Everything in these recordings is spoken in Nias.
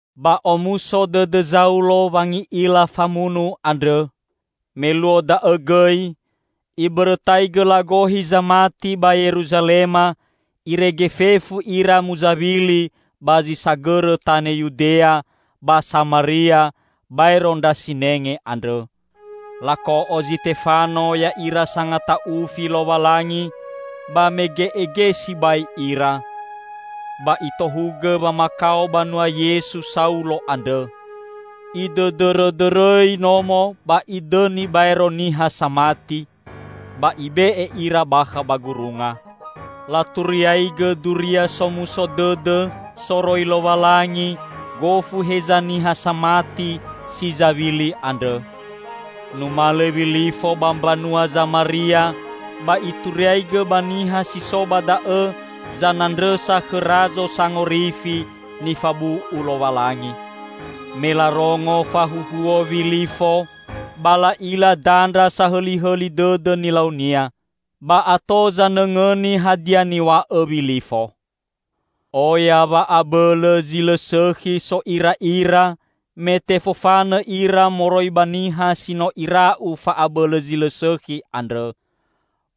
Ba omuso dõdõ Zaulo wangi'ila famunu andrõ. Me luo da'õ gõi, ibõrõtaigõ lagohi zamati ba Yeruzalema, irege fefu ira muzawili ba zi sagõrõ tanõ Yudea ba Samaria baero ndra sinenge andrõ. Lako'o Zitefano ya'ira sangata'ufi Lowalangi ba mege'ege sibai ira. Ba itohugõ wamakao banua Yesu Saulo andrõ. Idõdõrõdõrõi nomo ba idõni baero niha samati, ba ibe'e ira bakha ba gurunga. Laturiaigõ Duria Somuso Dõdõ soroi Lowalangi gofu heza niha samati si zawili andrõ. Numalõ Wilifo ba mbanua Zamaria ba ituriaigõ ba niha si so ba da'õ zanandrõsa khõ Razo Sangorifi nifabu'u Lowalangi. Me larongo fahuhuo Wilifo ba la'ila dandra sahõlihõli dõdõ nilaunia, ba ato zanõngõni hadia niw̃a'õ Wilifo. Oya wa'abõlõ zi lõ sõkhi so'ira'ira, me tefofanõ ira moroi ba niha si no ira'u fa'abõlõ zi lõ sõkhi andrõ.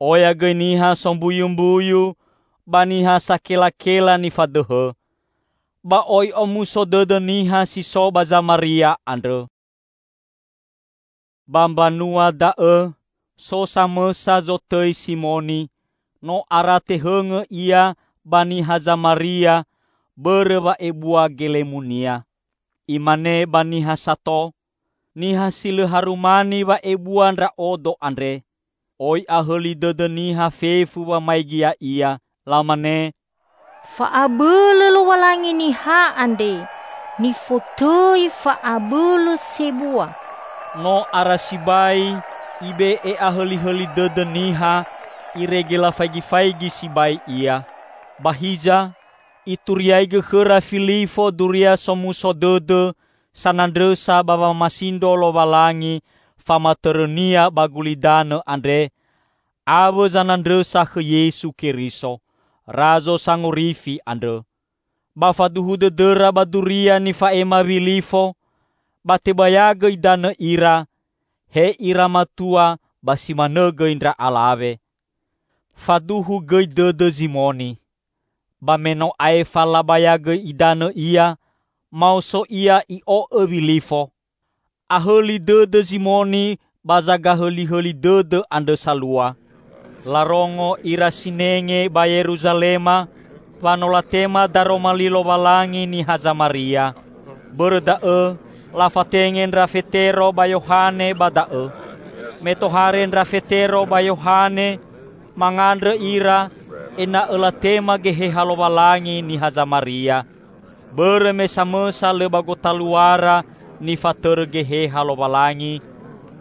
Oya gõi niha sombuyumbuyu ba niha sakelakela nifadõhõ. Ba oi omuso dõdõ niha si so ba Zamaria andrõ. Ba mbanua da'õ so samõsa zotõi Simoni, no ara tehõngõ ia ba niha Zamaria bõrõ wa'ebua gelemunia. Imane ba niha sato. Niha si lõ harumani wa'ebua ndra'odo andre. Oi ahõli dõdõ niha fefu wamaigi ya'ia. Lamane, "Fa'abõlõ Lowalangi niha andre, nifotõi 'Fa'abõlõ Sebua'." No ara sibai ibe'e ahõlihõli dõdõ niha irege lafaigifaigi sibai ia. Ba hiza ituriaigõ khõra Filifo Duria Somuso Dõdõ sanandrõsa ba wamasindro Lowalangi famatõrõ-Nia ba gulidanõ andre awõ zanandrõsa khõ Yesu Keriso, Razo Sangorifi andrõ. Ba faduhu dõdõra ba duria nifa'ema Wilifo, ba tebayagõ idanõ ira -- he ira matua ba si manõ gõi ndra alawe. Faduhu gõi dõdõ Zimoni. Ba me no aefa labayagõ idanõ ia, maoso ia i'o'õ Wilifo. Ahõli dõdõ Zimoni ba zagahõlihõli dõdõ andrõ salua. Larongo ira sinenge ba Yeruzalema wa no latema Daroma Li Lowalangi niha Zamaria. Bõrõ da'õ lafatenge ndra Fetero ba Yohane ba da'õ. Me tohare ndra Fetero ba Yohane, mangandrõ ira ena'õ latema Geheha Lowalangi niha Zamaria, bõrõ me samõsa lõ ba gotaluara nifatõrõ Geheha Lowalangi,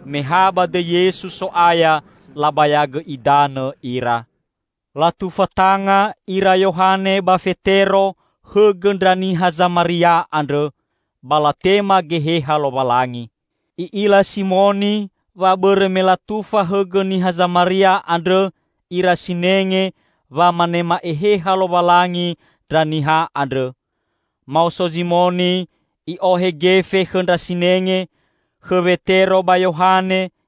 me ha ba dõi Yesu So'aya labayagõ idanõ ira. Latufa tanga ira Yohane ba Fetero hõgõ ndra niha Zamaria andrõ; ba latema Geheha Lowalangi. I'ila Simoni wa bõrõ me latufa hõgõ niha Zamaria andrõ ira sinenge wa manema Eheha Lowalangi ndra niha andrõ. Maoso Zimoni i'ohe gefe khõ ndra sinenge, khõ Wetero ba Yohane,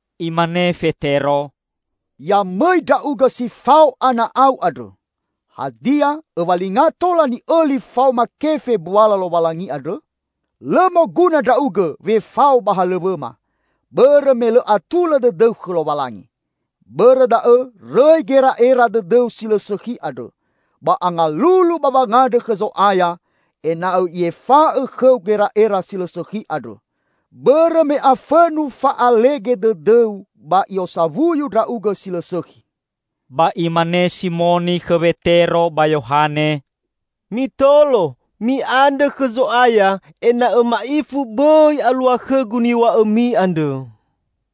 Imane Fetero, "Ya mõi ndra'ugõ si fao ana'au andrõ! Hadia õwalinga tola ni'õli faoma kefe mbuala Lowalangi andrõ? Lõ moguna ndra'ugõ wefao ba halõw̃õma, bõrõ me lõ atulõ dõdõu khõ Lowalangi. Bõrõ da'õ rõi gera'era dõdõu si lõ sõkhi andrõ, ba angalulu ba wangandrõ khõ Zo'aya ena'õ I'efa'õ khõu gera'era si lõ sõkhi andrõ! Bõrõ me afõnu fa'alege dõdõu ba i'osawuyu ndra'ugõ si lõ sõkhi." Ba imane Simoni khõ Wetero ba Yohane, "Mitolo, mi'andrõ khõ Zo'aya ena'õ ma'ifu bõi alua khõgu niw̃a'õmi andrõ."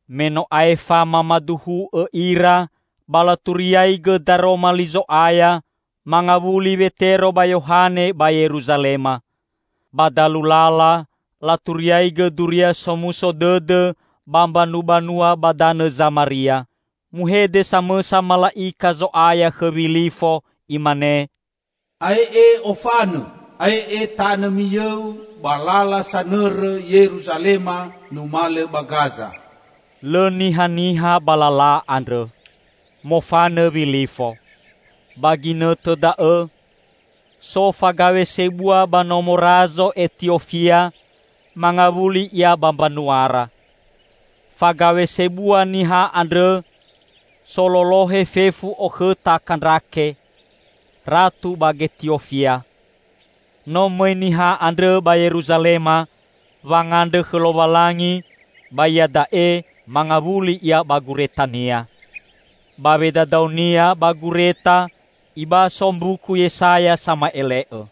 Me no aefa mamaduhu'õ ira ba laturiaigõ Daroma Li Zo'aya, mangawuli Wetero ba Yohane ba Yeruzalema. Ba dalu lala laturiaigõ Duria Somuso Dõdõ ba mbanubanua ba danõ Zamaria. Muhede samõsa mala'ika Zo'aya khõ Wilifo imane, "Ae'e ofanõ! Ae'e tanõ miyõu ba lala sanõrõ Yeruzalema numalõ ba Gaza." Lõ nihaniha ba lala andrõ. Mofanõ Wilifo. Ba ginõtõ da'õ so fagaw̃e sebua ba nomo Razo Etiofia mangawuli ia ba mbanuara. Fagaw̃e sebua niha andrõ sololohe fefu okhõta Kandrake, ratu ba Getiofia. No mõi niha andrõ ba Yeruzalema wangandrõ khõ Lowalangi ba iada'e mangawuli ia ba guretania. Ba wedadaonia ba gureta ibaso Mbuku Yesaya Sama'ele'õ.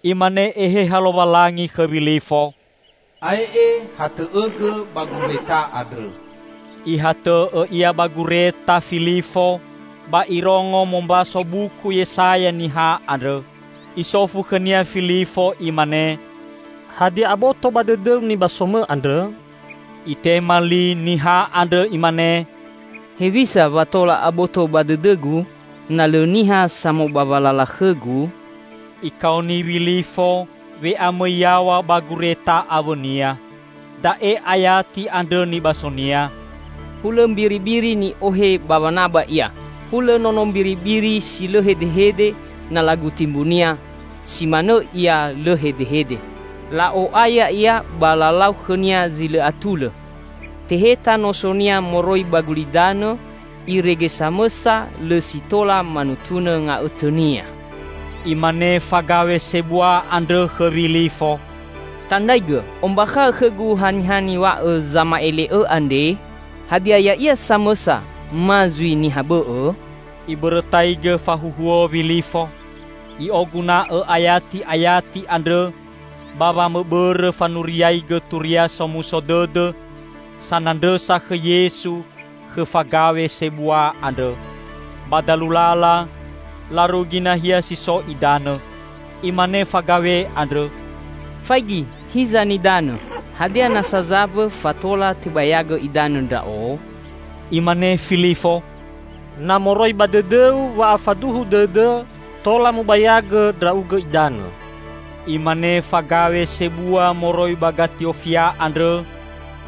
Imane Eheha Lowalangi khõ Wilifo, "Ae'e hatõ'õgõ ba gureta andrõ." Ihatõ'õ ia ba gureta Filifo ba irongo mombaso Buku Yesaya niha andrõ. Isofu khõnia Filifo imane, "Hadia aboto ba dõdõu nibasomõ andrõ?" Itema li niha andrõ imane, "Hewisa wa tola aboto ba dõdõgu, na lõ niha samobawa lala khõgu?" Ikaoni Wilifo we'amõi yaw̃a ba gureta awõnia. Da'e ayati andrõ nibasonia, "Hulõ mbiribiri ni'ohe ba wanaba ia, hulõ nono mbiribiri si lõ hedehede na laguti mbu-Nia, si manõ Ia lõ hedehede. La'o'aya Ia ba lalau khõ-Nia zi lõ atulõ. Teheta noso-Nia moroi ba gulidanõ irege samõsa lõ si tola manutunõ nga'õtõ-Nia." Imane fagaw̃e sebua andrõ khõ Wilifo, "Tandraigõ ombakha'õ khõgu haniha niw̃a'õ zama'ele'õ andre? Hadia ya'ia samõsa ma zui niha bõ'õ?" Ibõrõtaigõ fahuhuo Wilifo; i'oguna'õ ayati'ayati andrõ ba wamõbõrõ fanuriaigõ Turia Somuso Dõdõ sanandrõsa khõ Yesu khõ fagaw̃e sebua andrõ. Ba dalu lala larugi nahia si so idanõ. Imane fagaw̃e andrõ, "Faigi hiza nidanõ! Hadia nasa zambõ fa tola tebayagõ idanõ ndra'o?" [Imane Filifo, "Na moroi ba dõdõu wa'afaduhu dõdõ, tola mubayagõ ndra'ugõ idanõ." Imane fagaw̃e sebua moroi ba Getiofia andrõ,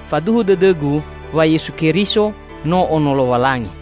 "Faduhu dõdõgu wa Yesu Keriso no Ono Lowalangi."]